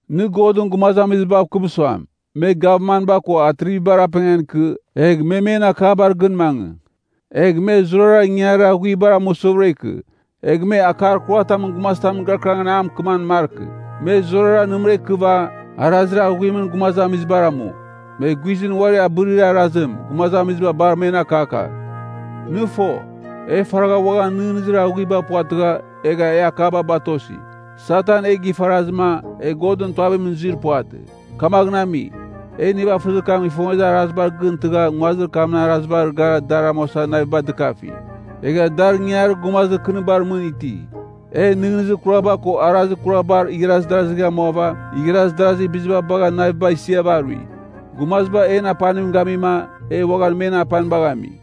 Nɨ Godɨn gumazamizibav kɨm suam, me gavmanba ko atrivibar apengan ikɨ, egh me men akabar gɨn mangɨ. Egh me zurara ingangarir aghuibar amusɨvɨra ikɨ. Egh me akar kuratamɨn gumazitamɨn gɨrakɨrangɨn a mɨkɨman markɨ. Me zurara nɨmɨra ikɨva, arazir aghuimɨn gumazamizibar amu. Me guizɨn uari abɨrir arazim, gumazamiziba bar men akakagh. Nɨ fo, e faragha uaghan nɨghnɨzir aghuiba puvatɨgha, egha e akaba batosi. Satan e gifarazɨma, e Godɨn tuavimɨn zuir puvatɨ. Kamaghɨn ami, e nivafɨzir kam ifongezir arazibar gɨn tɨgha nguazir kamɨn arazibar gara dar amuasa naviba dɨkafi. Egha dar ingangarir gumazir kɨnibar mɨn iti. E nɨghnɨzir kuraba ko arazir kurabar igharaz darazigh amuava igharaz darazir biziba bagha naviba isiava arui. Gumaziba en apanim gamima, e uaghan men apanibagh ami.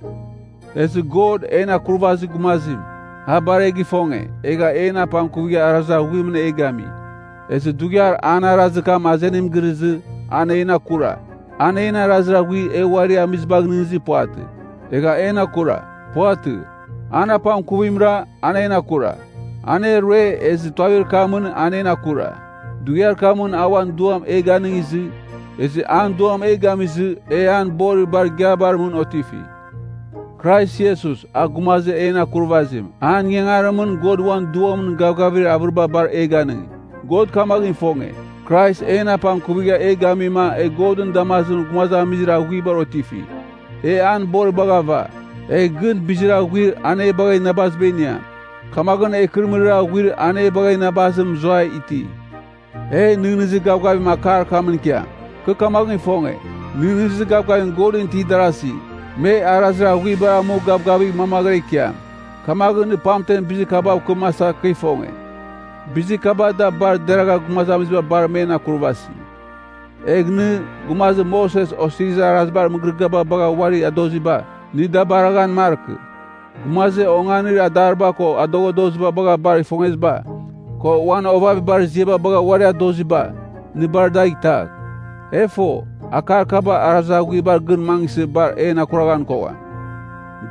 Ezɨ God, en Akurvazir Gumazim, a bar e gifonge, egha en apangkuvigha arazir aghuimɨn e gami. Ezɨ dughiar an arazir kam azenim girɨzɨ, an en akura. An en arazir aghuir e uari amizibagh nɨghnɨzir puvatɨ, egha en akura. Puvatɨ. An apangkuvimra, an en akura. An e rue, ezɨ tuavir kamɨn a en akura. Dughiar kamɨn a uan Duam e ganɨngizɨ, ezɨ an Duam e gamizɨ, e an borir bar igiabar mɨn otifi. Krais Iesus, a Gumazir en Akurvazim, an ingangarimɨn God uan Duamɨn gavgavir avɨriba bar e ginge. God kamaghɨn ifonge, Krais en apangkuvigha e gamima e Godɨn damazimɨn gumazamizir aghuibar otifi. E an boribagh ava, egh gɨn bizir aghuir an e bagha inabaziba iniam. Kamaghɨn e ikɨrɨmɨrir aghuir an e bagha inabazim mɨzuai iti. E nɨghnɨzir gavgavim akar kamɨn ikiam. Kɨ kamaghɨn ifonge, nɨghnɨzir gavgavim Godɨn itir darazi, me arazir aghuibar amu gavgavigh mamaghɨra ikiam. Kamaghɨn nɨ pamtemɨn bizir kabav kɨmasa kɨ ifonge. Bizir kaba da bar deragha gumazamiziba bar men akurvasi. Egh nɨ, gumazir Moses Osirizir Arazibar mɨgɨrɨgɨaba bagha uari adoziba, nɨ da baraghan markɨ. Gumazir onganir adariba ko adoghadoziba bagha bar ifongeziba, ko uan ovavibar ziaba bagha uari adoziba, nɨ bar dagh itagh. E fo, akar kaba arazir aghuibar gɨn mangɨsɨ bar en akuraghan kogham.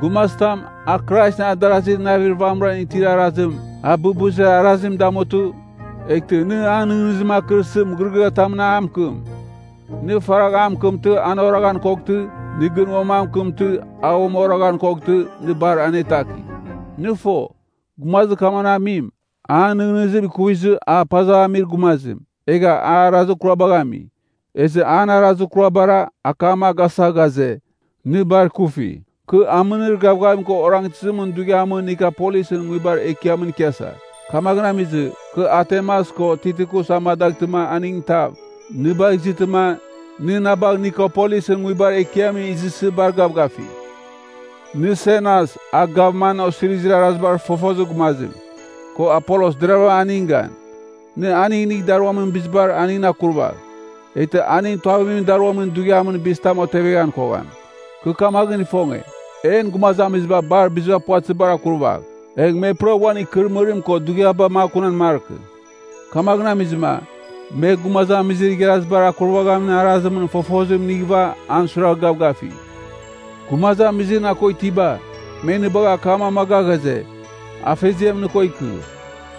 Gumazitam, a Kraisɨn adarazir navir vamɨran itir arazim, a bɨbɨzir arazim damutɨ, eghtɨ nɨ an nɨghnɨzim akɨrsɨ mɨgɨrɨgɨatamɨn a mɨkɨm. Nɨ faragh an mɨkɨmtɨ an oraghan koghtɨ, nɨ gɨn uam an mɨkɨmtɨ an uam oraghan koghtɨ, nɨ bar anetakigh. Nɨ fo, gumazir kamaghɨn amim, an nɨghnɨzim ikuvizɨ a pazava amir gumazim, egha an arazir kurabagh ami. Ezɨ an arazir kurabara, akam a gasa ghaze, nɨ bar ikufi. Kɨ amɨnir gavgavim ko orangtɨzimɨn dughiamɨn Nikopolisɨn nguibar ekiamɨn ikiasa. Kamaghɨn amizɨ, kɨ Artemas o Tikikus amadaghtɨma aningɨn tav, nɨ bagh izɨtɨma, nɨ na bagh Nikopolisɨn nguibar ekiamɨn izɨsɨ bar gavgafigh. Nɨ Senas, a gavman osirizir arazibar fofozir gumazim, ko Apolos deravɨram aningɨn gan. Nɨ aning inigh daruamin bizibar, aningɨn akurvagh. Eghtɨ aning tuavimɨn daruamin dughiamɨn bizitamɨn oteveghan kogham. Kɨ kamaghɨn ifonge, en gumazamiziba biziba bar puvatɨzibar akurvagh, egh me pura uan ikɨrɨmɨrim ko dughiaba makunan markɨ. Kamaghɨn amizɨma, me gumazamizir igharazibar akurvaghamin arazimɨn fofozim inighɨva an suiragh gavgafigh. Gumazamizir na ko itiba, me nɨ bagha akam amaga ghaze, Afeziam nɨ ko ikɨ.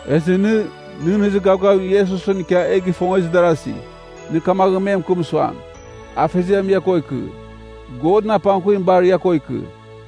Ezɨ nɨ, nɨghnɨzir gavgavim Iesusɨn ikia e gifongezir darazi, nɨ kamaghɨn me mɨkɨm suam, Afeziam ia ko ikɨ. Godɨn apangkuvim bar ia ko ikɨ.